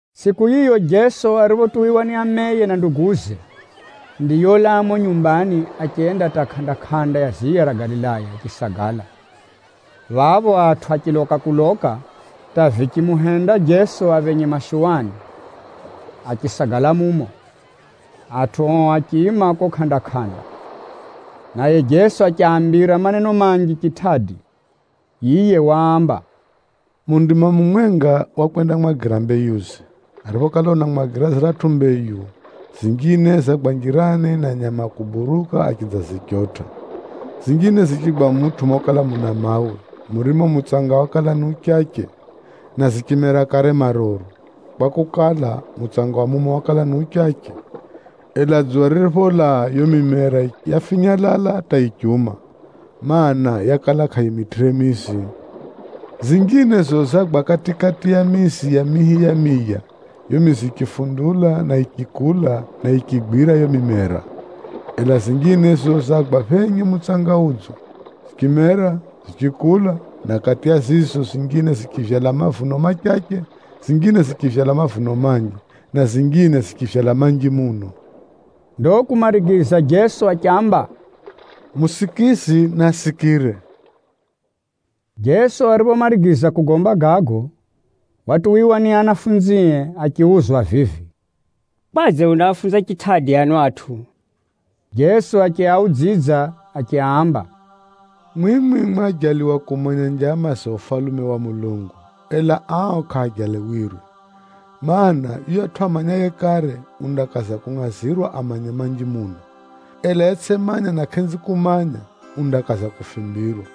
Tsʼiku yiyo Jeso ariphotuwiwa ni ameye na nduguze, ndiyolaa mumo nyumbani achenda hata kʼanda-kʼanda ya ziya ra Galilaya achisagala. Phapho atʼu achiloka kuloka hata vichimuhenda Jeso aphenye mashuwani, achisagala mumo. Atʼu ao achiima kuko kʼanda-kʼanda, naye Jeso achiaambira maneno manji chitʼadi. Yiye waamba: “Mundimwa mumwenga wakwendamwagira mbeyuze. Ariphokala unamwagira ziratʼu mbeyu, zinjine zagwa njirani, na nyama a kuburuka achidzazichotʼa. Zinjine zichigwa mutʼu mokala muna mawe, murimo mutsanga wakala ni uchache, na zichimera kare maruru, kwakukala, mutsanga wa mumo wakala ni uchache. Ela dzuwa riripholaa, yiyo mimera yafinyalala hata yichiuma, mana, yakala kʼayimitʼire mizi. Zinjine za zizo zagwa kati-kati ya mizi ya mihi ya miya, yiyo mizi yichifundula na yichikula, na yichigwira yiyo mimera. Ela zinjine za zizo zagwa phenye mutsanga udzo, zichimera, zichikula, na kati ya zizo, zinjine zichivyala mavuno machache, zinjine zichivyala mavuno manji, na zinjine zichivyala manji muno.” Ndo kumarigiza Jeso achiamba, “Musikizi naasikire!” Jeso ariphomarigiza kugomba gago, watuwiwa ni anafunzie achiuzwa vivi, “Kwadze unaafunza chitʼadi ano atʼu?” Jeso achiaudzidza achiaamba, “Mwimwi mwajaliwa kumanya njama za Ufalume wa Mulungu, ela ao kʼaajaliwirwe. Maana, yuyatʼu amanyaye kare undakaza kungʼazirwa amanye manji muno, ela yetsʼimanya na kʼenzi kumanya, undakaza kufimbirwa.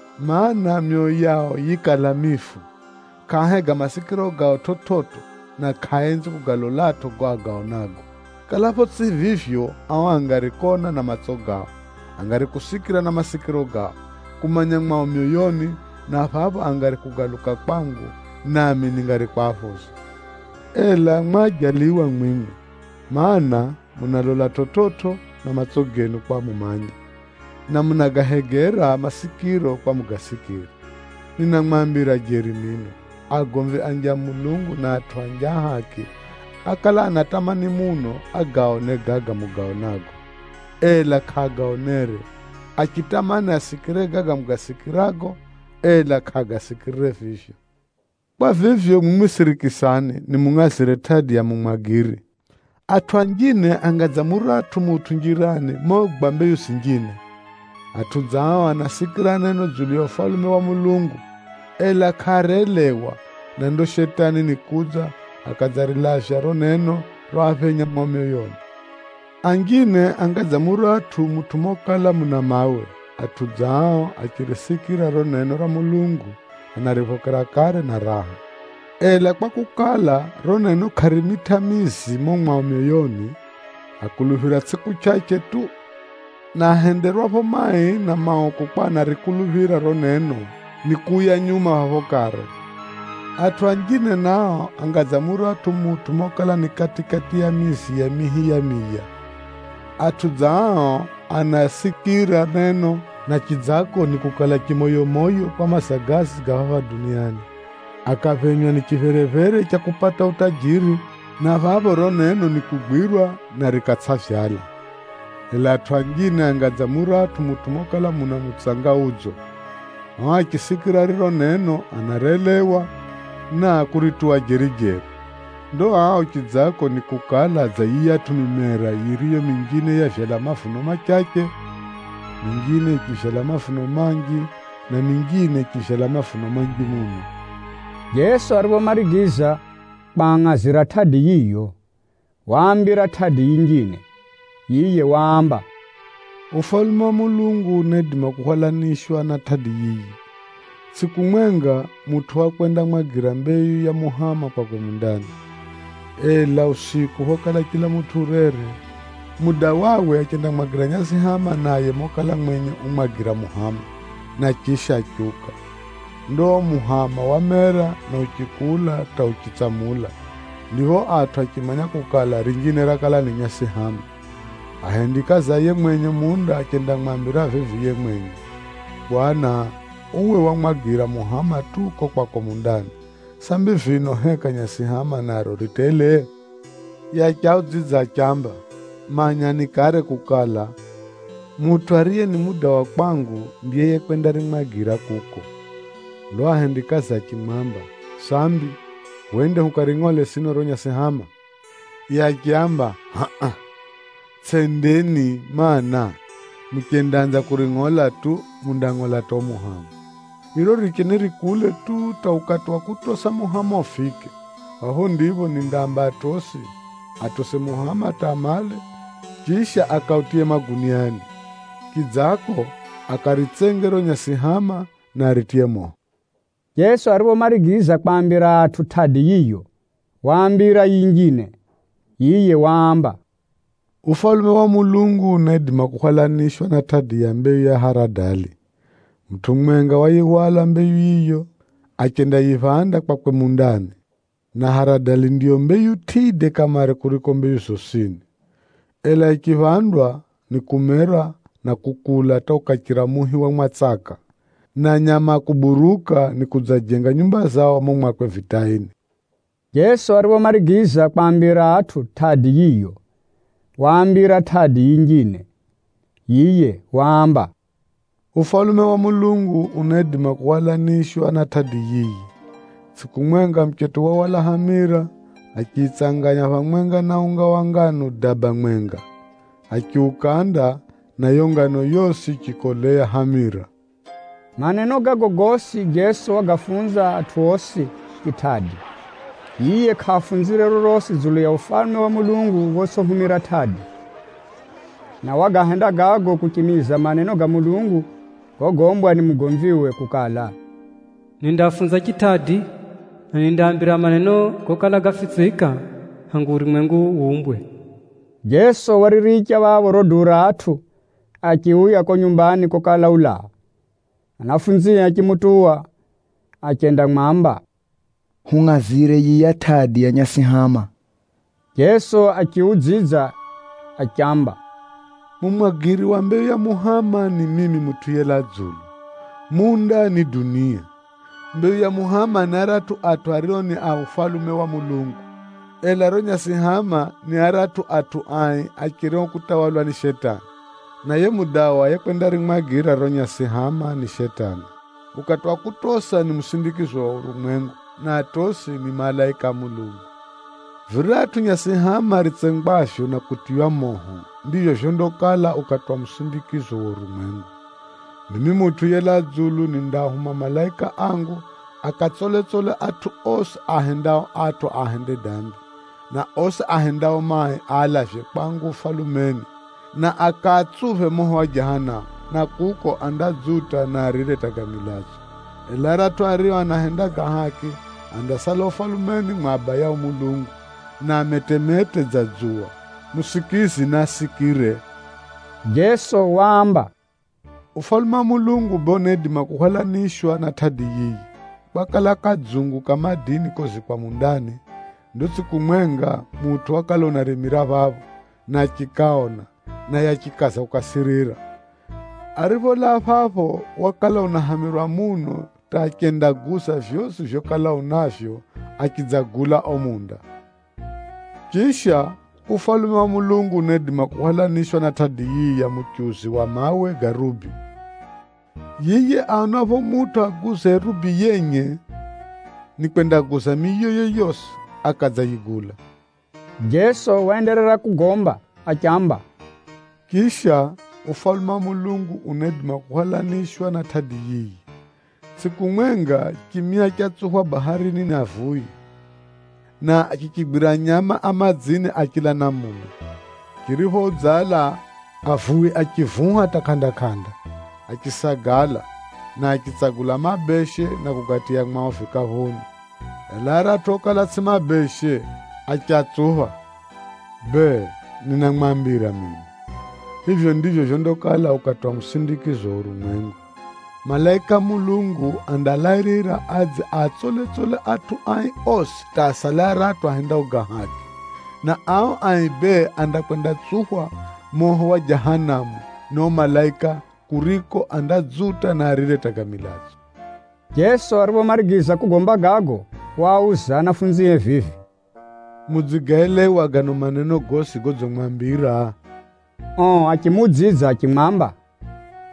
Maana, myoyo yao yikala mifu, kʼaahega masikiro gao chividzo, na kʼaaenzi kugalolatʼo gago agaonago. Kalapho tsʼi vivyo, ao angari kona na matso gao, angari kusikira na masikiro gao, kumanya mwao myoyoni, na phapho angari kugaluka kwangu, nami ningari kwaphoza.’ “Ela baha mwimwi, mana, munalola chividzo na matso genu kwa mumanye, na munagahegera masikiro kwa mugasikire. Ninamwambira jeri mino, agomvi a Mulungu anji na atʼu anji a haki, ákala anatamani muno agaone gaga mugaonago, ela kʼaagaonere. Achitamani asikire gaga mugasikirago, ela kʼaagasikirire vivyo. “Kwa vivyo, mwimwi sirikisani nimungʼazire tʼadi ya mumwagiri. Atʼu anjine anga dza muratʼu mutʼu njirani mogwa mbeyu zinjine. Atʼu dza ao anasikira neno dzulu ya Ufalume wa Mulungu, ela kʼaarelewa, na ndo Shetani nikudza, akadzarilavya riro neno roaphenya mwao myoyoni. Anjine anga dza muratʼu mutʼu mokala muna mawe. Atʼu dza ao achirisikira riro neno ra Mulungu, anariphokera kare na raha. Ela kwakukala, riro neno kʼarimitʼa mizi mumo mwao myoyoni, akuluphira tsʼiku chʼachʼe tu, na ahenderwapho mai na mauku kwa anarikuluphira riro neno, nikuuya nyuma phapho kare. Atʼu anjine nao, anga dza muratʼu mutʼu mokala ni kati-kati ya mizi ya mihi ya miya. Atʼu dza ao anasikira neno, na chidzako nikukala chimoyomoyo kwa mazagazi ga phapha duniani, akaphenywa ni chipherephere cha kupata utajiri, na phapho riro neno nikugwirwa, na rikatsʼavyala. Ela atʼu anjine, anga dza muratʼu mutʼu mokala muna mutsanga udzo. Ao achisikira riro neno anarelewa, na kurituwa jeri-jeri. Ndo ao chidzako nikukala dza yiyatʼu mimera yiriyo minjine yavyala mavuno machache, minjine yichivyala mavuno manji, na minjine yichivyala mavuno manji muno.” Jeso ariphomarigiza kwangʼazira tʼadi yiyo, waambira tʼadi yinjine. Yiye waamba, “Ufalume wa Mulungu unaidima kuhwalanishwa na tʼadi yiyi. Tsʼiku mwenga, mutʼu wakwendamwagira mbeyu ya muhama kwakwe mundani. Ela usiku phokala chila mutʼu urere, mudawawe achendamwagira nyasihama naye mokala mwenye umwagira muhama, na chisha achiuka. Ndo uo muhama wamera na uchikula hata uchitsamula, ndipho atʼu achimanya kukala, rinjine rakala ni nyasihama. Ahendikazi a yiye mwenye munda achendamwamba vivi yiye mwenye, ‘Bwana, uwe wamwagira muhama tu kuko kwako mundani. Sambi vino, heka nyasihama naro ri tele?’ Yiye achiaudzidza achiaamba, ‘Manyani kare kukala, mutʼu ariye ni mudawa kwangu, ndiye yiye kwendarimwagira kuko.’ Ndo ao ahendikazie achimwamba, ‘Sambi, hwende hukaringʼole sino riro nyasihama?’ Yiye achiaamba, ‘Hʼa-a, tsʼendeni, mana, muchendaanza kuringʼola tu, mundangʼola hata uo muhama. Riro riricheni rikule tu hata ukati wa kutosa muhama ufike. Phapho ndipho nindaamba atosi, atose muhama hata amale, chisha akautiye maguniani. Chidzako, akaritsenge riro nyasihama, na aritiye moho.’” Jeso ariphomarigiza kwaambira atʼu tʼadi yiyo, waambira yinjine. Yiye waamba, “Ufalume wa Mulungu unaidima kuhwalanishwa na tʼadi ya mbeyu ya haradali. Mutʼu mumwenga wayihwala mbeyu yiyo achendayiphanda kwakwe mundani, na haradali ndiyo mbeyu tʼide kamare kuriko mbeyu zosini. Ela yichiphandwa, nikumera na kukula hata ukachira muhi wa mwatsaka, na nyama a kuburuka nikudzajenga nyumba zao mumo mwakwe vitaini.” Jeso ariphomarigiza kwaambira atʼu tʼadi yiyo, waambira tʼadi yinjine. Yiye waamba, “Ufalume wa Mulungu unaidima kuhwalanishwa na tʼadi yiyi. Tsʼiku mwenga, muchetʼu wahwala hamira, achiyitsanganya phamwenga na unga wa nganu daba mwenga, achiukanda, na yiyo nganu yosi yichikolea hamira.” Maneno gago gosi, Jeso wagafunza atʼu osi chitʼadi. Yiye kʼaafunzire rorosi dzulu ya Ufalume wa Mulungu photsʼihumira tʼadi. Na Wagahenda gago kuchimiza maneno ga Mulungu gogombwa ni mugomviwe kukala, “Nindagomba namwi kwa kuhumira tʼadi, na nindamwambira maneno gokala gafitsika kulaa hangu urumwengu wumbwe.” Jeso wariricha phapho riro duu ra atʼu achiuya kuko nyumbani kokala ulaa. Anafunzie achimutuwa achendamwamba, “Hungʼazire yiya tʼadi ya nyasihama.” Jeso achiudzidza achiamba, “Mumwagiri wa mbeyu ya muhama ni mimi Mutʼu yelaa dzulu. Munda ni dunia. Mbeyu ya muhama ni aratʼu atʼu ario ni a Ufalume wa Mulungu. Ela riro nyasihama, ni aratʼu atʼu ai acherio kutawalwa ni Shetani. Na yiye mudawa yekwendarimwagira riro nyasihama ni Shetani. Ukati wa kutosa ni musindikizo wa urumwengu, na atosi ni malaika a Mulungu. Viratʼu nyasihama ritsengwavyo na kutiywa moho, ndivyo vyondakala ukati wa musindikizo wa urumwengu. Mimi Mutʼu yelaa dzulu nindaahuma malaika angu akatsoletsole atʼu osi aahendao atʼu ahende dambi, na osi ahendao mai aalavye kwangu Ufalumeni, na akaatsuphe moho wa Jahanamu, na kuko andadzuta na arire hata ga milatso. Ela aratʼu ario anahenda ga haki andasala Ufalumeni mwa Abayao Mulungu, na ametemete dza dzuwa. Musikizi naasikire!” Jeso waamba, “Ufalume wa Mulungu bee unaidima kuhwalanishwa na tʼadi yiyi. Kwakala kadzungu ka madini kozikwa mundani. Ndo tsʼiku mwenga, mutʼu wakala unarimira phapho, na achikaona, naye achikaza kukasirira. Aripholaa phapho, wakala unahamirwa muno hata achendaguza vyosi vyokala unavyo, achidzagula uo munda. “Chisha, Ufalume wa Mulungu unaidima kuhwalanishwa na tʼadi yiyi ya muchuzi wa mawe ga rubi. Yiye aonapho mutʼu aguzaye rubi yenye, nikwendaguza miyoye yosi akadzayigula.” Jeso waenderera kugomba achiamba, “Chisha, Ufalume wa Mulungu unaidima kuhwalanishwa na tʼadi yiyi. Tsʼiku mwenga, chimia chatsuphwa baharini ni avuwi, na chichigwira nyama a madzini a chila namuna. Chiriphoudzala, avuwi achivuha hata kʼanda-kʼanda, achisagala, na achitsagula mabeshe na kugatiya mwao vikaphuni. Ela aratʼu okala tsʼi mabeshe, achiatsupha. Bee, ninamwambira mino, vivyo ndivyo vyondakala ukati wa musindikizo wa urumwengu. Malaika a Mulungu andalairira, adze aatsole-tsole atʼu ai osi hata asale aratʼu ahendao ga haki. Na ao ai bee andakwendatsuphwa moho wa Jahanamu ni ao malaika, kuriko andadzuta, na arire hata ga milatso.” Jeso ariphomarigiza kugomba gago, waauza anafunzie vivi, “Mudzigaelewa gano maneno gosi godzimwambira?” Ao achimuudzidza achimwamba,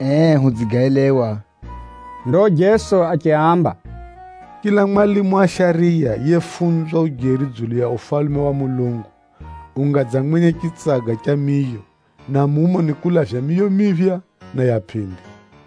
“Ee hudzigaelewa.” Ndo Jeso achiaamba, “Chila mwalimu wa shariya yefunzwa ujeri dzulu ya Ufalume wa Mulungu, unga dza mwenye chitsaga cha miyo, na mumo nikulavya miyo miphya, na ya pʼindi.”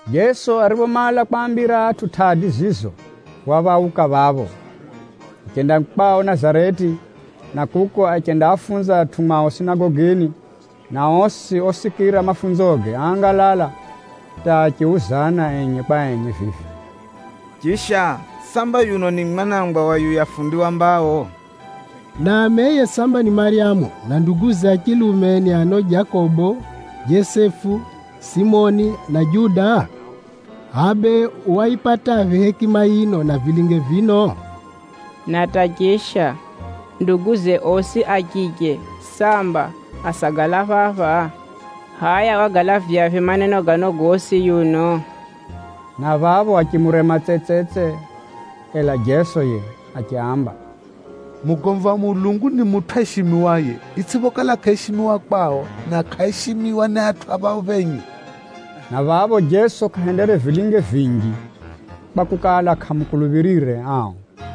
Jeso ariphomala kwaambira atʼu tʼadi zizo, waphauka phapho, achenda kwao Nazareti, na kuko achendaafunza atʼu mwao sinagogini, na osi osikira mafunzoge áangalala, hata achiuzana enye kwa enye vivi, “Chisha, samba yuno ni mwana wa yuya fundi wa mbao? Na ameye samba ni Maryamu, na nduguze a chilume ni ano Jakobo, Jesefu, Simoni, na Juda? Hʼaya bee wayipataphi hekima yino, na vilinge vino? Na hata chisha, nduguze osi a chiche samba asagala phapha? Hʼaya wagalavyaphi maneno gano gosi yuno?” Na phapho achimurema tsetsetse. Ela Jeso yiye achiaamba, “Mugomvi wa Mulungu ni mutʼu aishimiwaye, itsʼiphokala kʼaishimiwa kwao, na kʼaishimiwa ni atʼu a phao phenye.” Na phapho Jeso kʼahendere vilinge vinji, kwakukala, kʼaamukuluphirire ao.